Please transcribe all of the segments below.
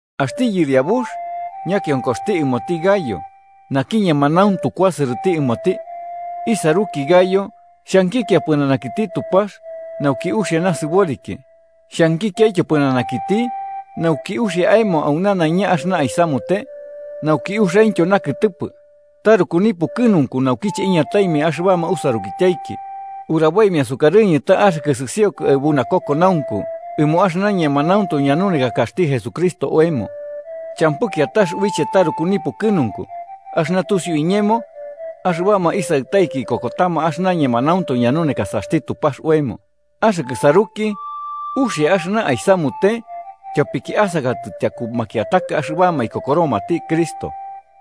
Axti yɨriabux ñakionkoxti ɨmoti Gayo, naki ñemanauntu kuasɨrɨti ɨmoti. Isaruki Gayo, xhankikia pɨnanakiti Tupax, nauki uxia nasɨboriki, xhankikiaityo pɨnanakiti nauki uxia aemo au nanaiña axɨna aisamute, nauki uxiaintyo nakɨtɨpɨ. Taruku nipukɨnunku naukiche iñataimia axɨbama usarukityaiki uraboimia sukarɨñɨ ta axɨkɨ sɨsiokɨ aɨbu nakokonaunku ɨmo axɨna ñemanauntu ñanunekakaxti Jesucristo oemo. Champɨ kiatax uiche taruku nipukɨnunku axɨna tusiu iñemo axɨbama isaɨtaiki ikokotama axɨna ñemanauntu ñanunekasaxti Tupax oemo. Axɨkɨ saruki, uxia axɨna aisamute tyopiki asakatɨ tyaku makiataka axɨbama ikokoromati Cristo,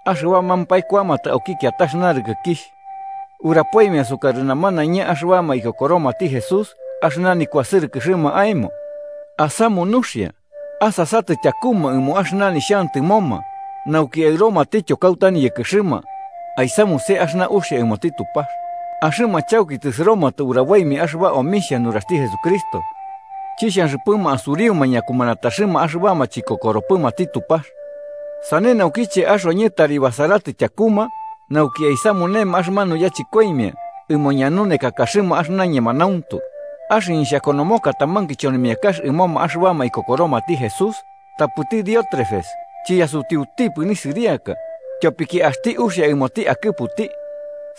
axɨbamampae kuamatɨ auki kiatax narɨkɨkixh. Urapoimia sukarɨ namanaiña axɨbama ikokoromati Jesús axɨna nikuasɨrɨkɨxɨma aemo. Asamu nuxia, asasatɨ tyakuma ɨmo axɨna nixhantɨmoma nauki aɨromatityo kauta niyɨkɨxɨma, aisamuse axɨna uxia ɨmoti Tupax. Axɨma chauki tɨsɨromatɨ uraboimia axɨba omixhia nuraxti Jesucristo, chixhanxɨpɨma asuriuma ñakumanataxɨma axɨbama chikokoropɨmati Tupax. Sane naukiche axoñɨ tari basaratɨ tyakuma, nauki aisamunema axɨmanu yachɨkoimia ɨmo ñanunekakaxɨma axɨna ñemanauntu. Axɨñɨ xhakonomoka taman kichonimiakax ɨmoma axɨbama ikokoromati Jesús, tapɨti Diótrefes chiyasutiutipɨ nisɨriaka, tyopiki axti uxia ɨmoti akɨputi.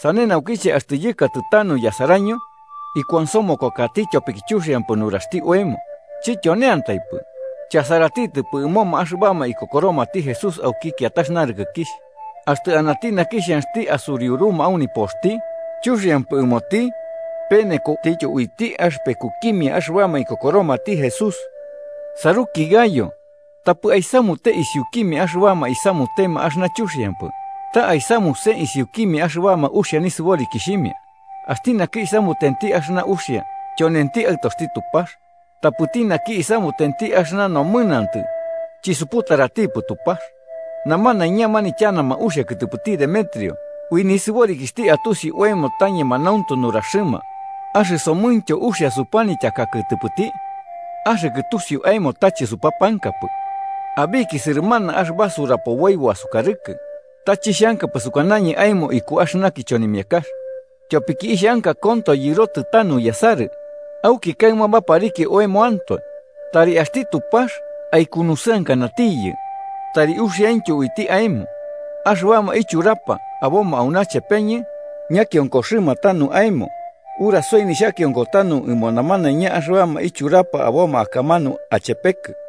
Sane naukiche axtɨ yɨkatɨ tanu yasaraño, ikuansomokokati, tyopiki chuxiampɨ nuraxti oemo. Chityoneantaipɨ, chasaratitɨpɨ ɨmoma axɨbama ikokoromati Jesús auki kiatax narɨkɨkixh. Axtɨ anati naki xhanxti asuriuruma au nipoxti, chuxiampɨ ɨmoti penekotityo uiti axɨpekukimia axɨbama ikokoromati Jesús. Saruki Gayo, tapɨ aisamute isiukimia axɨbama isamutema axɨna chuxiampɨ, ta aisamuse isiukimia axɨbama axia nisɨborikixhimia uxia. Axti naki isamutenti axɨna uxia, tyonenti aɨtoxti Tupax, tapɨti naki isamutenti axɨna nomɨnantɨ chisuputaratipɨ Tupax. Namanaiña manityanama uxia kɨtɨpɨti Demetrio, u nisɨborikixhti atusi oemo ta ñemanauntu nuraxɨma. Axɨsomɨntyo uxia supanityaka kɨtɨpɨti, axɨkɨ tusiu aemo ta chɨsupapankapɨ. Abiki sɨrɨmana axɨba surapoboibo asukarɨkɨ, ta chixhankapɨ sukanañɨ aemo iku axɨna kichonimiakax, tyopiki ixhanka konto yɨrotɨ tanu yasarɨ, auki kaɨma baparikia oemoantoe. Tari axti Tupax aikunusɨankanatiyɨ tari uxiaintyo uiti aemo. Axɨbama ichurapa aboma auna chepeñɨ ñakionkoxɨma tanu aemo. Urasoi nixhakionko tanu ɨmo namanaiña axɨbama ichurapa aboma akamanu achepekɨ.